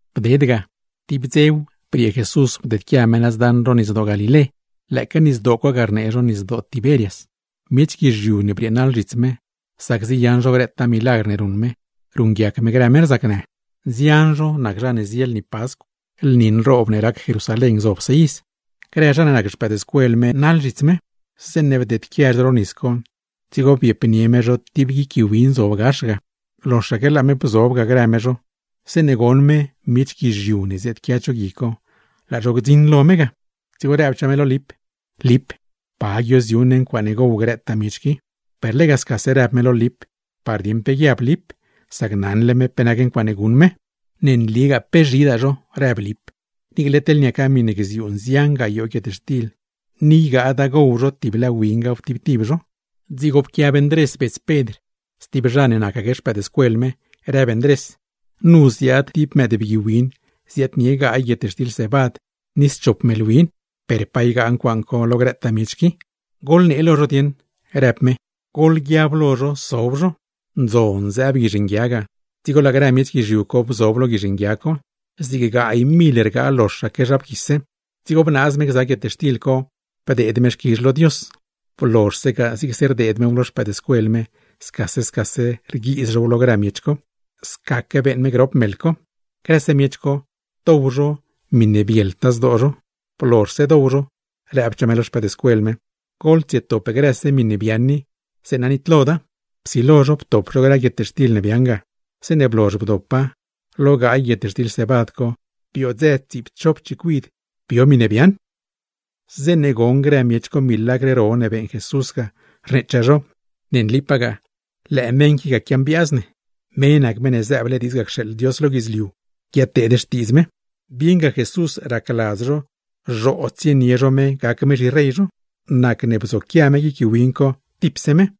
Bded ga, tib dzew briee Jesús bdedquia me nëz daṉ ro Nisdoo Galilé (lëëque nisdoo co ga rnee zho Nisdoo Tiberias). Miech guizhiu ne brieenaḻ zhits me, sac ziyaṉ zho grëtaa milagr ne ruṉ me, ruṉguiac me grë meṉ rzacnë. Nzian zho nac zha ne zie lni Pascw, lni nroob ne rac Jerusalén gzobse iz. Grëse no ne nac no xpëëdscuel me, laa no naḻ zhits me. Zeeṉe bdieedquia no ro nis co, dzigo bdzieep no tib cho gui win zob gax ga. Loxaque laa no bzioob ga grë no me, zeeṉe bdzioṉ no miech guizhiu ne ziaadquia cho gui co, laa zho glansole lo no ga. Dzigo rëbchaa me lo Lip: ―Lip, ¿pa guioziu ne ncuaaṉe gow grëtaa miech qui? Per lega scase rëb me lo Lip, par dieṉ pe guiab Lip; sac naṉle me pe nac ncuaaṉe guṉ me. ―¡Ne nligaa pe zhidaa zho! ―rëb Lip―. Niicle teḻne niaca miṉe gziuu nzian gayoo guietxtil, ni ygaad ncuaaṉ co ygaa zho tiblë wingaw tib tib zho. Dzigo pquiab Ndrés, bets Pedr, stib zha ne nacgza no; rëb Ndrés: ―Nu zo tib mëëdbgui win ney gaay guietxtil cebad ni schop meḻ win. ¿Per pa ygaa ncuaaṉ co lo grëtaa miech qui? ―Goḻnee lo zho dieṉ ―në me lo no―. Goḻguiab lo zho sob zho. Ndzon zëëb guizh nguia ga, dzigo laa grë miech guizhiu co bzob lo guizh nguia co (zig gaay mil rgaa loxaque zha bguise). Dzigo bnaaz me gza guietxtil co, bdeed me xquizh lo Dios. Blozhse ga, zigse rneedz mew lo no scase scase rguiiz now lo grë miech co; scaque beeṉ me grop meḻ co. ¡Grëse miech co, dow zho zaatne bieltaa zho! Blozhse dow zho, nëchaa me lo no: ―¡Goḻtsietop grëse miṉe biaaṉ i, zeeṉa nitloda! Psilo no ptop no grë guietxtil ne biaaṉ ga, zeeṉe blozh bdopa, ¡lo gaay guietxtil cebad co, biodzë tsiipchop chicuid biow! Zeeṉe goṉ grë miech co milagr ro ne beeṉ Jesús ga, rneechaa zho: ―¡Ne nlipagaa, lëë meṉ qui ga quiambiaaz ne! ¡Me nac Meṉ ne zëëble diidz ga cxeeḻ Dios lo guidzliu guiadteed xtiidz me! Bieṉga Jesús racladz zho, zhoo tsienie zho me gac me zhirey zho, nacne bzoquia me guic gui win co, tipse me.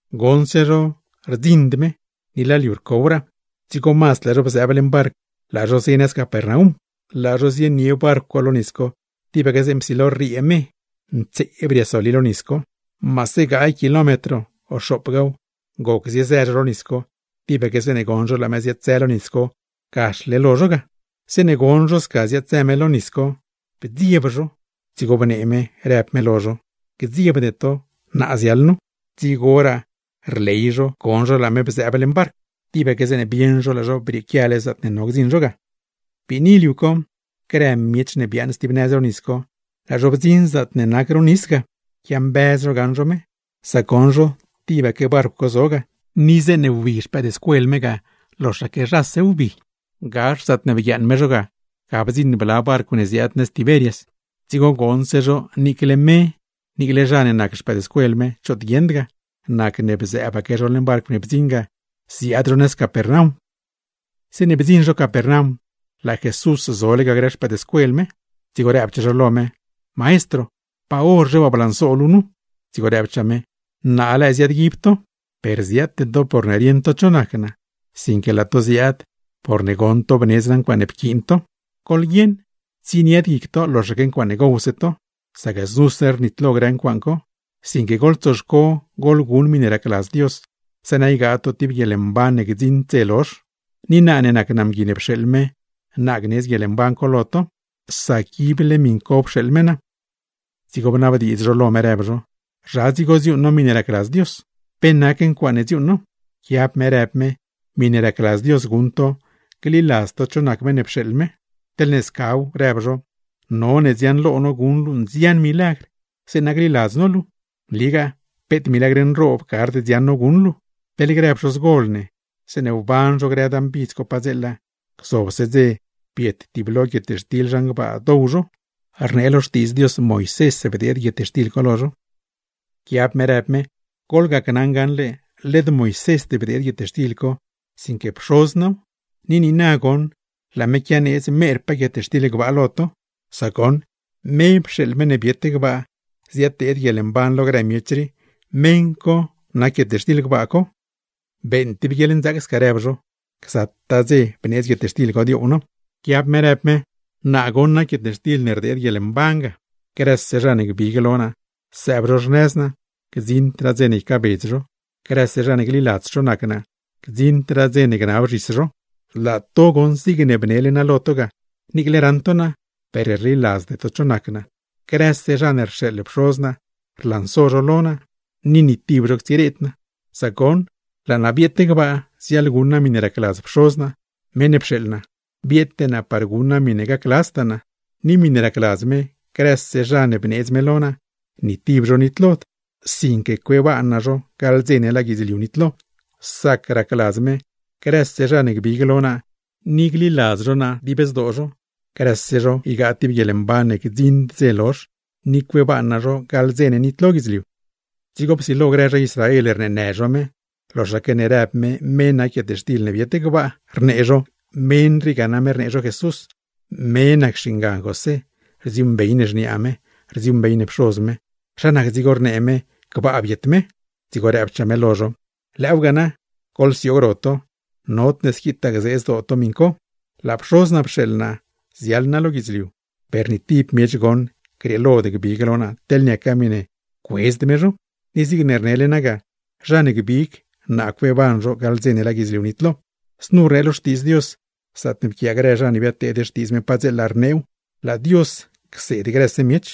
Bdzioṉse no choot rlansod ni laa liu rcowraa, dzigo mazd laa no bziaab leṉ canó, laa no zio nëz Capernaum. Laa no zionie canó co lo nis, tibaque zeeṉe psilo rriee me, ntseeb riasoli lo nis co. Maase gaay kilómetro o xoopgaaw goc zio no, tibaque zeeṉe bdzioṉ no laa me ziaad-zë lo nis co, gaxle lo no ga. Zeeṉe bdzioṉ no sca ziaad-zë me lo nis, bdzieeb no. Dzigo bnee me, në me lo no: ―¡Gdziebde to! ¡Naa ziaḻ nu! Dzigoraa rley no bdzioṉ no laa me bzëëb leṉ barcw; tibaque zeeṉe bieṉ no laa no brieequiale zaatne no gdziṉ no ga. Biini liu co, grë miech ne biaaṉ stib nëz ro nis co, laa zho bdziṉ zaatne nac ro nis ga, quiambëz zho gaṉ zho me. Sac goṉ zho tibaque barcw zo ga, ni zeeṉe wbii no ga, loxaque nose wbii. Gax zaatne bguiaaṉ me zho ga, ga bdziṉ bla barcw ne ziaad nëz Tiberias; dzigo goṉse zho niicle me niicle no ne nac no xpëëdscuel me, choot guieṉd ga, nacne bzëëbaque zho leṉ barcw ne bdziṉ ga ziaad zho nëz Capernaum. Zeeṉe blanso zho Capernaum, laa Jesús zole lo no ga; dzigo rëbchaa zho lo me: ―Maestro, ¿pa horzhe waa blanso luu nu? Dzigo rëbchaa me: ―¿Naa lëë ziaadguib to? Per ziaate to porne rieṉ to cho nac naa, sinque laa to ziaad porne goṉ to bnedz naa ncuaaṉe pquiin to. ¡Goḻguieṉ, tsienied guic to loxaque ncuaaṉe gowse to, sac znuse rnitlo grë ncuaaṉ co! Sinque, goḻtsoxco goḻguṉ miṉe racladz Dios, zeeṉa ygaa to tib guieḻmban ne ib gdziṉd dze lozh. Ni naa ne nac naa Mgui ne pxeeḻ me, naa gneedz guieḻmban co lo to; sac ible miṉ co pxeeḻ me naa. Dzigo bnabdiidz zho lo me, rëb zho: ―¿Zha dzigo dziuuṉ no miṉe racladz Dios? ¿Pe nac ncuaaṉe dziuuṉ no? Pquiab me rëb me: ―Miṉe racladz Dios guṉ to: gliladz to cho nac meṉ ne pxeeḻ me. ―Teḻne scaw ―rëb zho―, none dziaṉlo no guṉ luu nzian milagr, zeeṉa gliladz no luu. ¡Nligaa peet milagr nroob gard dziaṉ no guṉ luu! Teḻ grë pxozgol ne, zeeṉe wban zho grë dan bidz co padzeela, gzobse dze biet tiblo guietxtil zhan gbaa, dow zho; rnee lo Xtiidz Dios: “Moisés rdeed guietxtil co lo zho.” Pquiab me rëb me: ―Goḻgacnaṉ gaṉle led Moisésd bdeed guietxtil co, sinque Pxoz naaw. Ni niina goṉ laa me quianeedz merpaa guietxtil gbaa lo to. Sac goṉ, me pxeeḻ meṉ ne biet gbaa ziaddeed guieḻmban lo grë miech rii; meṉ co nac guietxtil gbaa co. ―Beeṉ tib guieḻnzaac sca ―rëb zho―, ¡gzataa dze bneedz guietxtil co dioow no! Pquiab me rëb me: ―Naa goṉ nac guietxtil ne rdeed guieḻmban ga. Grëse zha ne gbig lo naa sëëb zho xnëz naa, gdziṉdraa dze ne ycaabedz zho; grëse zha ne gliladz cho nac naa, gdziṉdraa dze ne gnab zhis zho. Laa to goṉ, zigne bnelegaa naa lo to ga, ¡niicle raṉ to naa, per rliladzde to cho nac naa! Grëse zha ne rxeeḻ Pxoz naa, rlanso lo naa; ni tib zho ctsireed naa. Sac goṉ, laa naa bieet gbaa ziaḻguṉ naa miṉe racladz Pxoz naa (meṉ ne pxeeḻ naa); bieete naa par guṉ naa miṉe gacladztaa naa. Ni miṉe racladz me, grëse zha ne bneedz me lo naa, ni tib zho nitlod, sinque cueeban naa zho gaḻ dze ne laa guidzliu nitlo. Sac racladz me: grëse zha ne gbig lo naa ni gliladz zho naa dib zdoo zho, grëse zho ygaa tib guieḻmban ne ib gdziṉd dze lozh, ni cueeban naa zho gaḻ dze ne nitlo guidzliu. Dzigo psilo grë zha Israel rneenë zho me, loxaque ne rëb me, me nac guietxtil ne biet gbaa; rnee zho: ―Meṉ rii ga name rnee zho Jesús, me nac xingan José. Rdziuuṉbey ne xniaa me, rdziuuṉbey ne pxoz me. ¿Zha nac dzigo ne rnee me gbaa biet me? Dzigo rëbchaa me lo zho: ―Lëëwga na, goḻsioog ro to. Nodne squitaa gzee zdoo to miṉ co. Laa Pxoz naa pxeeḻ naa ziaḻ naa lo guidzliu, per ni tib miech goṉ grieelod gbig lo naa teḻne niaca miṉe cuedzd me zho; ni zig rnele naa ga, zha ne gbig, naa cueeban zho gaḻ dze ne laa guidzliu nitlo. Znu rnee lo Xtiidz Dios, zaatne pquiaa grë zha ne biadteed xtiidz me padzeela, rneew: “Laa Dios cseed grëse miech.”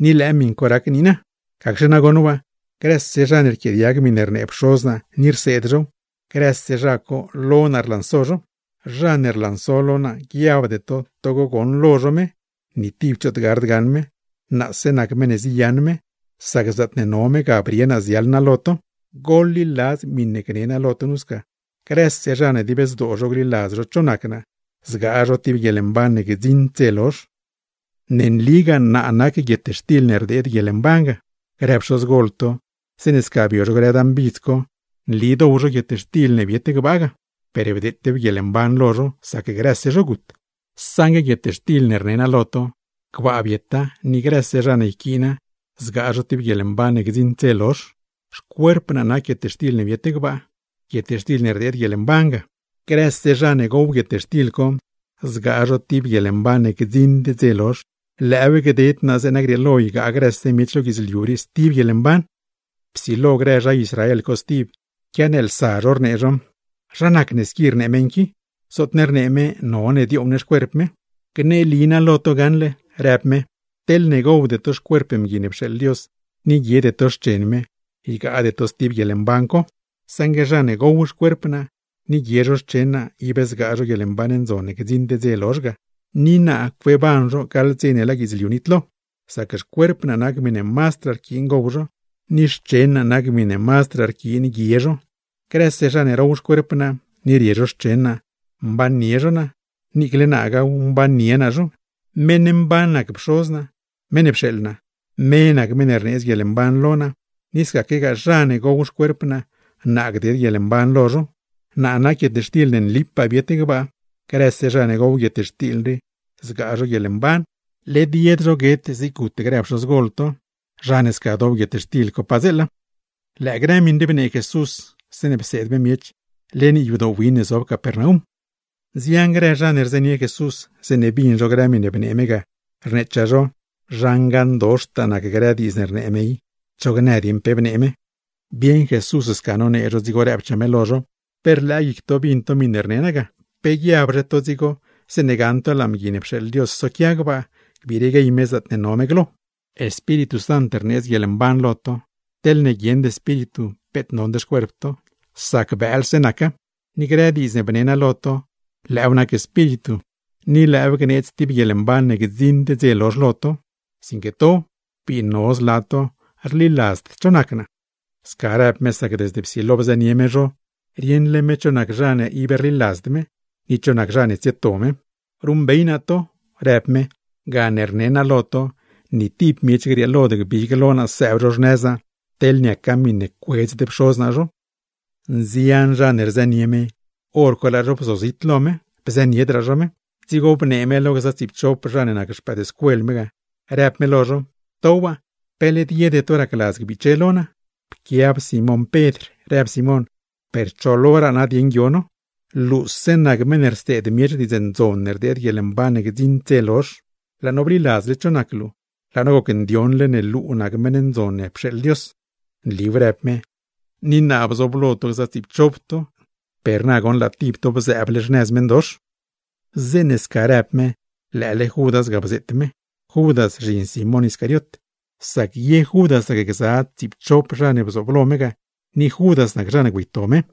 Ni lëë miṉ co rac niina; gacxe nagoṉ waa, grëse zha ne rquiaadiag miṉe rnee Pxoz naa ni rseed zhow, grëse zha co lo naa rlanso zho. Zha ne rlanso lo naa, guiabde to togo goṉlo zho me; ni tib choot gard gaṉ me, naase nac meṉ ne ziyaṉ me, sac zaatne no me ga brie naa ziaḻ naa lo to. Goḻliladz miṉe gni naa lo to nu sca: ¡Grëse zha ne dib zdoo zho gliladz zho cho nac naa, zgaa zho tib guieḻmban ne gdziṉdraa dze lozh! Ne nligaa naa nac guietxtil ne rdeed guieḻmban ga. Grë pxozgol to, zeeṉe sca bio zho grë dan bidz co, nli dow zho guietxtil ne biet gbaa ga, per bdeetew guieḻmban lo zho, sac grëse zho gut. Saṉgue guietxtil ne rne naa lo to, gbaa bieta ni grëse zha ne yquiina zgaa zho tib guieḻmban ne gdziṉd dze lozh. Xcuerp naa nac guietxtil ne biet gbaa, miṉe rdeed guieḻmban ga; grëse zha ne gow guietxtil co, zgaa zho tib guieḻmban ne gdziṉd dze lozh. Lëëw gded naa zeeṉa grieelo ygaa grëse miech lo guidzliu rii stib guieḻmban. Psilo grë zha Israel co stib, quianeelsa zho, rnee zho: ―¿Zha nacne squi rnee meṉ qui? ¡Zootne rnee me none dioow ne xcuerp me! ―Gneli naa lo to gaṉle ―rëb me―, teḻne gowde to xcuerp Mgui ne pxeeḻ Dios, ni guiede to xchen me, ygaade to stib guieḻmban co. Saṉgue zha ne gow xcuerp naa, ni guie zho xchen naa, ib zgaa zho guieḻmban ndzon ne gdziṉd dze lozh ga, ni naa cueeban zho gaḻ dze ne laa guidzliu nitlo; sac xcuerp naa nac miṉe mazdraa rquiin gow miech, ni xchen naa nac miṉe mazdraa rquiin guie zho. Grëse zha ne row xcuerp naa, ni rie zho xchen naa, mbannie zho naa, niiclegaa naaw mbannie naa zho. Meṉ mban nac Pxoz naa, meṉ ne pxeeḻ naa, me nac meṉ rneedz guieḻmban lo naa; ni scaquegaa zha ne gow xcuerp naa, naa gded guieḻmban lo zho. Naa nac guietxtil ne nlipaa biet gbaa. Grëse zha ne gow guietxtil rii, zgaa zho guieḻmban; led yed zho guet zig gut grë pxozgol to, zha ne sca dow guietxtil co. Lëë grë miṉ rii bnee Jesús zeeṉe pseed me miech leṉ yadoo win ne zob Capernaum. Nzian grë zha ne rzënie Jesús, zeeṉe bin zho grë miṉe bnee me ga, rneechaa zho: ―Zha ngaṉdoxtaa nac grë diidz ne rnee me i. ¡Cho gnë dieṉ pe bnee me! Bieṉ Jesús sca nonee zho, dzigo rëbchaa me lo zho: ―¿Pe rlëë guic to bin to miṉe rne naa ga? ¿Pe guiabzhe to dzigo zeeṉe gaṉ to laa Mgui ne pxeeḻ Dios soquia gbaa, gbiire guey me zaatne no me glo? Espíritu Sant rneedz guieḻmban lo to, teḻne guieṉd espíritu peet nond xcuerp to, sac bëëlse naca. Ni grë diidz ne bne naa lo to, lëëw nac Espíritu, ni lëëw gneedz tib guieḻmban ne gdziṉd dze lozh lo to; sinque to, bii no zla to rliladzd cho nac naa. Sca rëb me sac desde psilo bzënie zho me, rieṉle me cho nac zha ne ib rliladzd me, ni cho nac zha ne tsieto me. ―Ruṉbey naa to ―rëb me―, gane ni naa lo to ni tib miech grieelod gbig lo naa sëëb zho xnëz naa, teḻne niaca miṉe cuedzd Pxoz naa zho. Nzian zha ne rzënie me, hor co laa zho bzozit lo me, bzëniedraa zho me. Dzigo bnee me lo no gza tsiipchop no ne nac no xpëëdscuel me, në me: ―To waa, ¿pe led yede to racladz gbiche lo naa? Pquiab Simón Pedr, rëb Simón: ―¿Per cho loraa nadieṉ guio no? Luuse nac meṉ ne rseed miech diidz ndzon ne rdeed guieḻmban ne gdziṉd dze lozh. Laa no bliladzle cho nac luu, laa no gocndioṉle ne luu nac Meṉ Ndzon ne pxeeḻ Dios. ―Nliw ―rëb me―, ni naa bzooblo to gza tsiipchop to, per na goṉ laa tib to bzëëble xnëz meṉdox. Zeeṉe sca rëb me, lëële Judas ga bzeet me (zhin Simón Iscariot); sac ye Judas nacgza no lo tsiipchop no ne bzooblo me ga, ni Judas nac zha ne güeyto me.